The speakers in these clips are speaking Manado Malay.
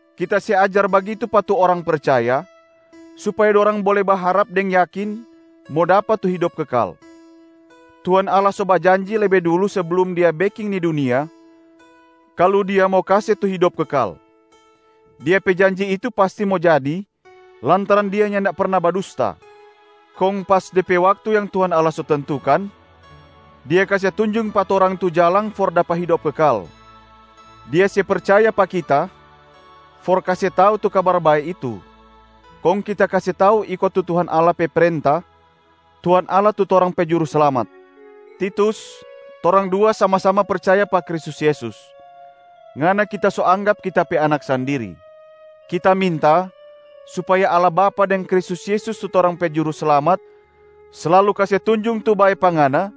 Kita se ajar bagitu pa tu orang percaya, supaya dorang bole baharap deng yakin mo dapa tu hidop kekal. Tuhan Allah so bajanji lebe dulu seblum Dia beking ni dunia kalu Dia mo kase tu hidop kekal. Dia pe janji itu pasti mo jadi lantaran Dia nyanda perna badusta. Kong pas de pe waktu yang Tuhan Allah so tentukan, Dia kase tunjung pa torang tu jalang for dapa hidop kekal. Dia se percaya pa kita for kase tau tu Kabar Bae itu, kong kita kase tau iko tu Tuhan Allah pe prenta, Tuhan Allah tu torang pe Juruslamat. Titus, torang dua sama-sama percaya pa Kristus Yesus, ngana kita so anggap kita pe anak sandiri. Kita minta supaya Allah Bapa deng Kristus Yesus tu torang pe Juruslamat slalu kase tunjung tu bae pa ngana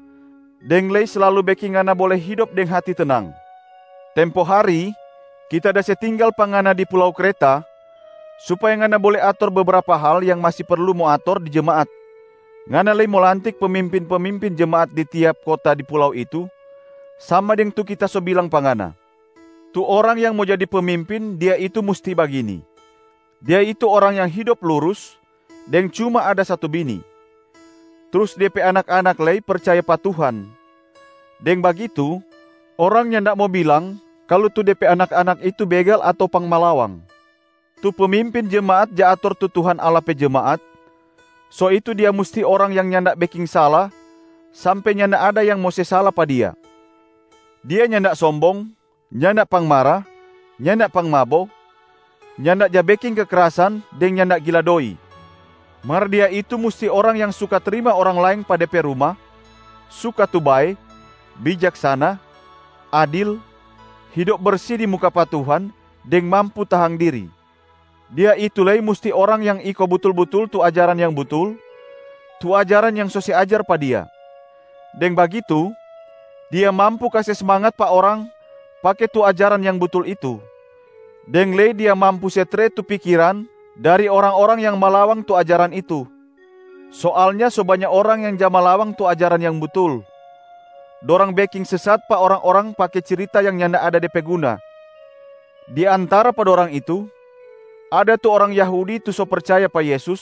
deng lei slalu beking ngana bole hidop deng hati tenang. Tempo hari, kita da se tinggal pa ngana di pulau Kreta supaya ngana bole ator bebrapa hal yang masi perlu mo ator di jemaat. Ngana lei mo lantik pemimpin-pemimpin jemaat di tiap kota di pulau itu sama deng tu kita so bilang pa ngana. Tu orang yang mo jadi pemimpin, dia itu musti bagini: dia itu orang yang hidop lurus deng cuma ada satu bini. Trus de pe anak-anak lei percaya pa Tuhan, deng bagitu orang nyanda mo bilang kalu tu de pe anak-anak itu begal ato pangmalawang. Tu pemimpin jemaat ja ator tu Tuhan Allah pe jemaat, so itu dia musti orang yang nyanda beking sala sampe nyanda ada yang mo se sala pa dia. Dia nyanda sombong, nyanda pangmara, nyanda pangmabo, nyanda ja beking kekrasan deng nyanda gila doi. Mar dia itu musti orang yang suka trima orang laeng pa de pe ruma, suka tu bae, bijaksana, adil, hidop bersi di muka pa Tuhan deng mampu tahang diri. Dia itu lei musti orang yang iko butul-butul tu ajaran yang butul, tu ajaran yang so se ajar pa dia. Deng bagitu, dia mampu kase smangat pa orang pake tu ajaran yang butul itu, deng lei dia mampu se tre tu pikiran dari orang-orang yang malawang tu ajaran itu. Soalnya so banya orang yang ja malawang tu ajaran yang butul. Dorang beking sesat pa orang-orang pake cirita yang nyanda ada de pe guna. Di antara pa dorang itu, ada tu orang Yahudi tu so percaya pa Yesus,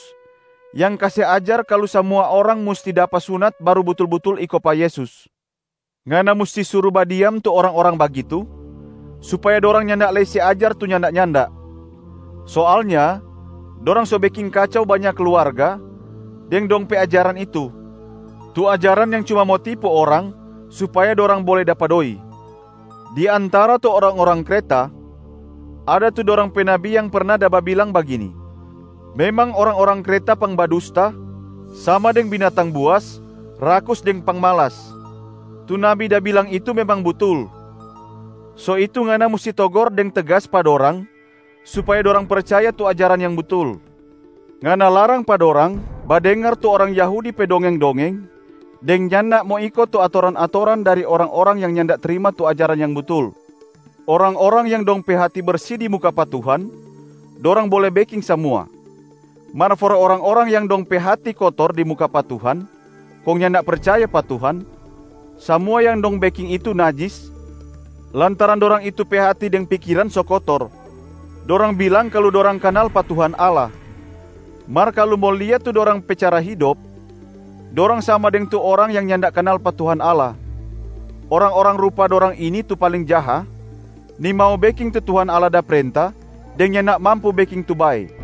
yang kase ajar kalu samua orang musti dapa sunat baru butul-butul iko pa Yesus. Ngana musti suru badiam tu orang-orang bagitu, supaya dorang nyanda lei se ajar tu nyanda-nyanda. Soalnya dorang so beking kacau banya kluarga deng dong pe ajaran itu, tu ajaran yang cuma mo tipu orang supaya dorang bole dapa doi. Di antara tu orang-orang Kreta, ada tu dorang pe nabi yang perna da babilang bagini, “Memang orang-orang Kreta pangbadusta, sama deng binatang buas, rakus deng pangmalas.” Tu nabi da bilang itu memang butul. So itu ngana musti togor deng tegas pa dorang supaya dorang percaya tu ajaran yang butul. Ngana larang pa dorang badengar tu orang Yahudi pe dongeng-dongeng deng nyanda mo iko tu atoran-atoran dari orang-orang yang nyanda trima tu ajaran yang butul. Orang-orang yang dong pe hati bersi di muka pa Tuhan, dorang bole beking samua. Mar for orang-orang yang dong pe hati kotor di muka pa Tuhan kong nyanda percaya pa Tuhan, samua yang dong beking itu najis lantaran dorang itu pe hati deng pikiran so kotor. Dorang bilang kalu dorang kanal pa Tuhan Allah, mar kalu mo lia tu dorang pe cara hidop, dorang sama deng tu orang yang nyanda kanal pa Tuhan Allah. Orang-orang rupa dorang ini tu paling jaha, nimau beking tu Tuhan Allah da prenta deng nyanda mampu beking tu bae.